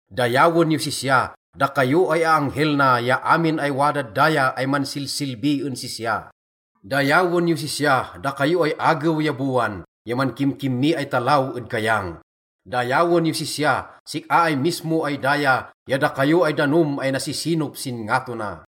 Dayawen yos sisya, dakayo ay aanghel na ya amin ay wadad daya ay mansilsilbi en sisya. Dayawen yos sisya, dakayo ay agew ya bowan, ya mankimkimmi ay talaw ed kayang. Dayawen yos sisya, sik-a ay mismo ay daya ya dakayo ay danom ay nasisinop sin ngato na.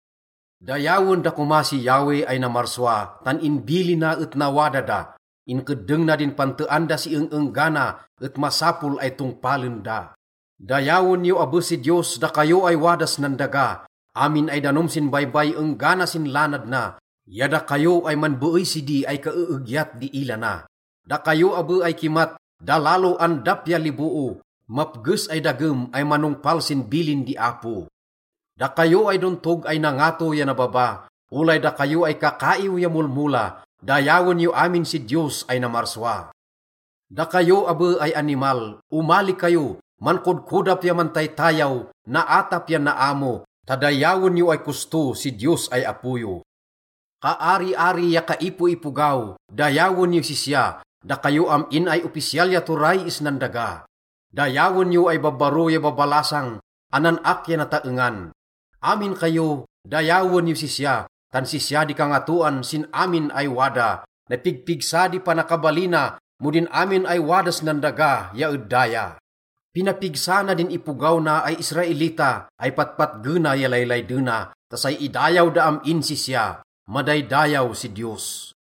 Dayawen da koma si Yahweh ay namarsua, tan inbilina et nawada da. Inkeddeng na di pantean da si eng-enggana et masapol ay tongpalen da. Dayawen yo abe si Diyos, dakayo ay wadas nan daga, amin ay danom sin baybay enggana sin lanad na, ya dakayo ay manbeey sidi ay kaeegyat di ila na, dakayo abe ay kimat, dalalo, andap ya liboo, mapges ay dagem ay manongpal sin bilin di Apo. Dakayo ay dontog ay nangato ya nababa, olay dakayo ay kakaiw ya molmola, dayawen yo amin si Diyos ay namarsua. Dakayo abe ay animal, omali kayo, mankodkodap ya mantaytayaw, naatap ya naamo, ta dayawen yo ay kosto si Diyos ay Apo yo. Kaariari ya kaipoipogaw, dayawen yos sisya, dakayo am-in ay opisyal ya turay isnan daga. Dayawen yo ay babbaro ya babalasang, anan-ak ya nataengan. Amin kayo, dayawen yos sisya, tan sisya di kangatoan sin amin ay wada, napigpigsa di panakabalina mo din amin ay wadas nan daga ya ed daya. Pinapigsa na din ipogaw na ay Israelita, ay patpatgena ya laylaydena, ta say idayaw da am-in sisya. Madaydayaw si Diyos!